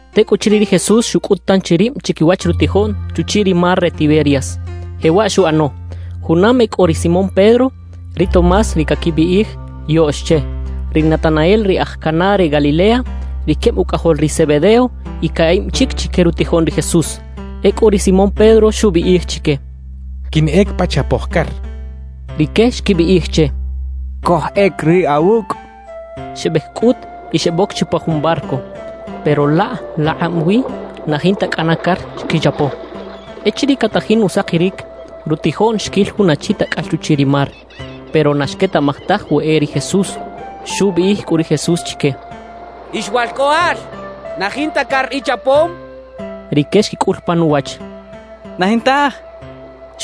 Tecꞌuchiriꞌ ri Jesús xucꞌut tanchi rib chiquiwach rutijoꞌn chuchiꞌ ri mar re Tiberias. Jewaꞌ xuꞌano: Junam e cꞌo ri Simón Pedro, ri Tomás ri caquibiꞌij “Yoꞌx” che, ri Natanael ri aj Caná re Galilea, ri queb ucꞌajol ri Zebedeo y caꞌib chic chique rutijoꞌn ri Jesús. Ecꞌu ri Simón Pedro xubiꞌij chique: —Quinꞌec pa chapoj car —xchaꞌ. Rique xquibiꞌij che: —Cojꞌec riꞌ awucꞌ —xechaꞌ. Xebec cꞌut y xeboc bi chupa jun barco, pero laꞌ laꞌkꞌab wi na jinta cꞌana car xquichapo. Echiriꞌ catajin usakiric, rutijoꞌn xquil jun achi tacꞌal chuchiꞌ ri mar, pero na xquetaꞌmaj taj we e ri Jesús. Xubiꞌij cꞌu ri Jesús chique: —Ix walcꞌoꞌal, ¿na jinta car ichapom? —xchaꞌ. Rique xquicꞌul pan uwach: —Na jintaj —xechaꞌ.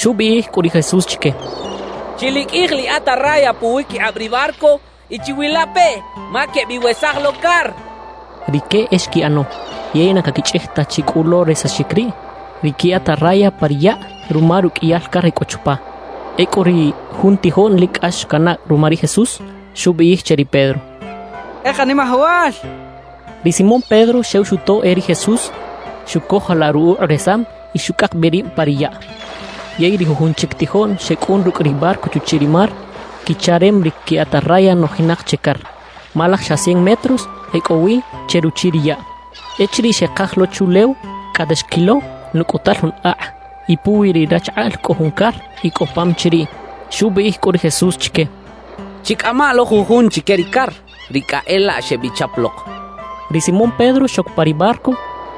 Xubiꞌij cꞌu ri Jesús chique: —Chiliqꞌuij liꞌatarraya puwiquikꞌab ri barco y chiwilapeꞌ ma quebiwesaj lo car —xchaꞌ. Rique e xquiꞌano yey na caquichꞌij ta chi cꞌu lo resaxic riꞌ ri qui atarraya pa ri yaꞌ ruma ruqꞌuiyal car e cꞌo chupa. Ecꞌu ri jun tijoꞌn lic cꞌax canaꞌ ruma ri Jesús, xubiꞌij che ri Pedro: —¡E Kanimajawal! —xchaꞌ. Ri Simón Pedro xew xuto e ri Jesús, xucojolaꞌ rukꞌuꞌ resam y xucꞌak bi rib pa ri yaꞌ. Yey ri jujun chic tijoꞌn xecꞌun rucꞌ ri barco chuchiꞌ ri mar, quicharem ri qui atarraya nojinak che car, ma laj xa cien metros e cꞌo wi che ruchiꞌ ri yaꞌ. Echiriꞌ xekaj lo chuꞌlew, cꞌate xquilo nucꞌutal jun akꞌ, y puwi ri rachakꞌaꞌl cꞌo jun car y cꞌo pam chiriꞌ. Xubiꞌij cꞌu ri Jesús chique: —Chicꞌama lo jujun chique ri car, ri cꞌa e laꞌ xebichap lok —xchaꞌ. Ri Simón Pedro xoc pa ri barco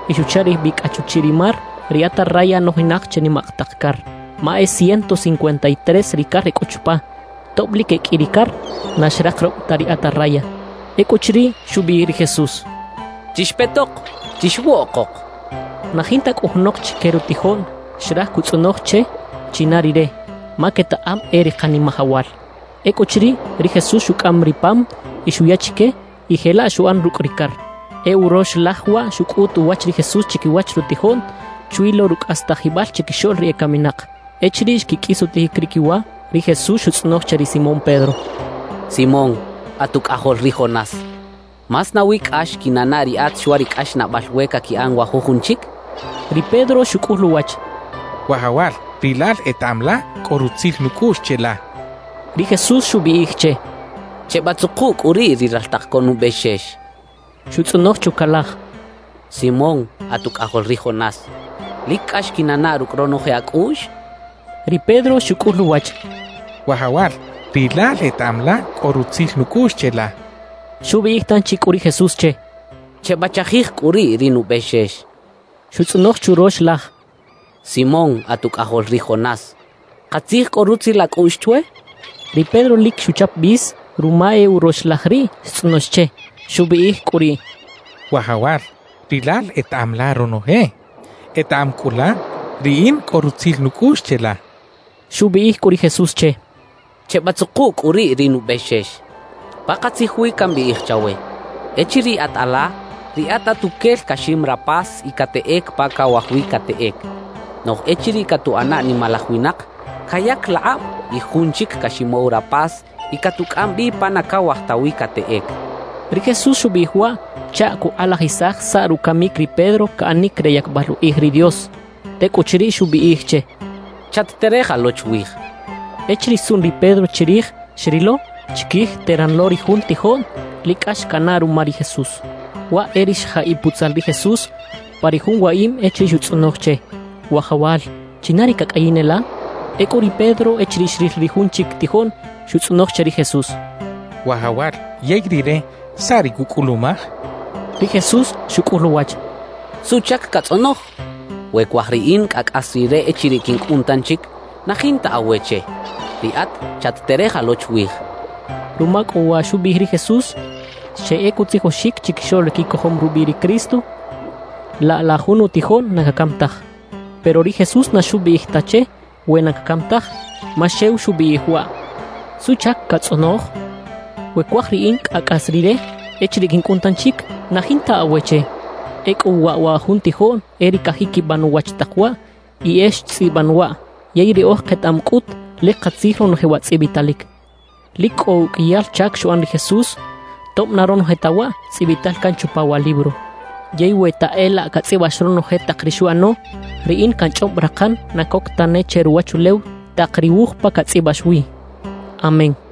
y xucharej bi cꞌa chuchiꞌ ri mar ri atarraya nojinak che nimak tak car, ma e ciento cincuenta y tres ri car e cꞌo chupa. Tob lic e qꞌui ri car, na xrakaroꞌb ta ri atarraya. Ecꞌuchiriꞌ, xubiꞌij ri Jesús: —Chixpetok, chixwoꞌkok —xcha chique. Na jinta cꞌu junok chique rutijoꞌn xraj cutzꞌonoj che china Rire, ma quetaꞌam e ri Kanimajawal. Ecꞌuchiriꞌ, ri Jesús xucꞌam ri pam y xuya chique, y jelaꞌ xuꞌan rucꞌ ri car. E urox laj waꞌ xucꞌut uwach ri Jesús chiquiwach rutijoꞌn chwi lo rucꞌastajibal chiquixoꞌl ri ecaminak. Echiriꞌ xquiqꞌuis utijic ri quiwa, ri Jesús xutzꞌonoj che ri Simón Pedro: —Simón, at ucꞌajol ri Jonás, ¿más nawi cꞌax quinanaꞌ riꞌat chwa ri cꞌaxnaꞌbal we caquiꞌan wa jujun chic? —xchaꞌ. Ri Pedro xucꞌul uwach: —Wajawal, rilal etaꞌam la cꞌo rutzil nucꞌuꞌx cheꞌla —xchaꞌ. Ri Jesús xubiꞌij che: —Chebatzuku cꞌu riꞌ ri raltak co nubexex —xchaꞌ. Xutzꞌonoj chucalaj: —Simón, at ucꞌajol ri Jonás, ¿lic cꞌax quinanaꞌ rucꞌ ronoje acꞌuꞌx? —xchaꞌ. Ri Pedro xucꞌul uwach: —Wajawal, rilal etaꞌam la cꞌo rutzil nucꞌuꞌx cheꞌla —xchaꞌ. Xubiꞌij tanchi cꞌu ri Jesús che: —Chebachajij cꞌu riꞌ ri nubexex —xchaꞌ. Xutzꞌonoj churox laj: —Simón, at ucꞌajol ri Jonás, ¿katzij cꞌo rutzil acꞌuꞌx chwe? —xchaꞌ. Ri Pedro lic xuchap bis ruma e urox laj riꞌ xtzꞌonox che. Xubiꞌij cꞌu riꞌ: —Wajawal, rilal etaꞌam la ronoje, etaꞌam cꞌu la riꞌin cꞌo rutzil nucꞌuꞌx cheꞌla —xcha che. Xubiꞌij cꞌu ri Jesús che: —Chebatzuku cꞌu riꞌ ri nubexex. Pakatzij wi cambiꞌij chawe: Echiriꞌ at ala, riꞌat atuquel caxim rapas y cateꞌec pa cawaj wi cateꞌec. Noꞌj echiriꞌ catuꞌana nimalaj winak, cayac laꞌkꞌab y jun chic caximow rapas y catucꞌam bi pa na cawaj ta wi cateꞌec —xchaꞌ. Ri Jesús xubiꞌij waꞌ chaꞌ cukꞌalajisaj saꞌ rucamic ri Pedro caꞌanic re yacbal ukꞌij ri Dios. Tecꞌuchiriꞌ, xubiꞌij che: —¡Chat-tereja lo chwij! —xchaꞌ. Echiriꞌ xtzuꞌn ri Pedro chirij, xrilo chiquij teran lo ri jun tijoꞌn lic cꞌax canaꞌ ruma ri Jesús, waꞌ e ri xjaꞌiꞌ putzal ri Jesús pa ri jun waꞌim echiriꞌ xutzꞌonoj che: «Wajawal, ¿China ri cacꞌayin e la?» Ecꞌu ri Pedro echiriꞌ xril ri jun chic tijoꞌn, xutzꞌonoj che ri Jesús: —Wajawal, yey rire, ¿saꞌ ri cucꞌulumaj? —xchaꞌ. Ri Jesús xucꞌul uwach: —¿Suꞌchac catzꞌonoj? We cuaj riꞌin cꞌa cꞌas rire echiriꞌ quincꞌun tanchic, na jinta awe che. Riꞌat chat-tereja lo chwij —xchaꞌ. Ruma cꞌu wa xubiꞌij ri Jesús, xeꞌec utzijoxic chiquixoꞌl ri quicojom rubiꞌ ri Cristo: «Laꞌ la jun utijoꞌn na cacam taj.» Pero ri Jesús na xubiꞌij ta che we na cacam taj, ma xew xubiꞌij waꞌ: «¿Suꞌchac catzꞌonoj? We cuaj riꞌin cꞌa cꞌas rire echiriꞌ quincꞌun tanchic, na jinta awe che.» Ecꞌu waꞌ wa jun tijoꞌn e ri cajiquiban uwach tak waꞌ y e xtzꞌiban waꞌ. Yey riꞌoj ketaꞌam cꞌut lic katzij ronoje wa tzꞌibitalic. Lic cꞌo uqꞌuiyal chac xuꞌan ri Jesús tob na ronoje ta waꞌ tzꞌibital can chupa wa libro. Yey we ta e laꞌ catzꞌibax ronoje tak ri xuꞌano, riꞌin canchꞌob rakan na coc tane che ruwachulew tak ri wuj pa catzꞌibax wi. Amén.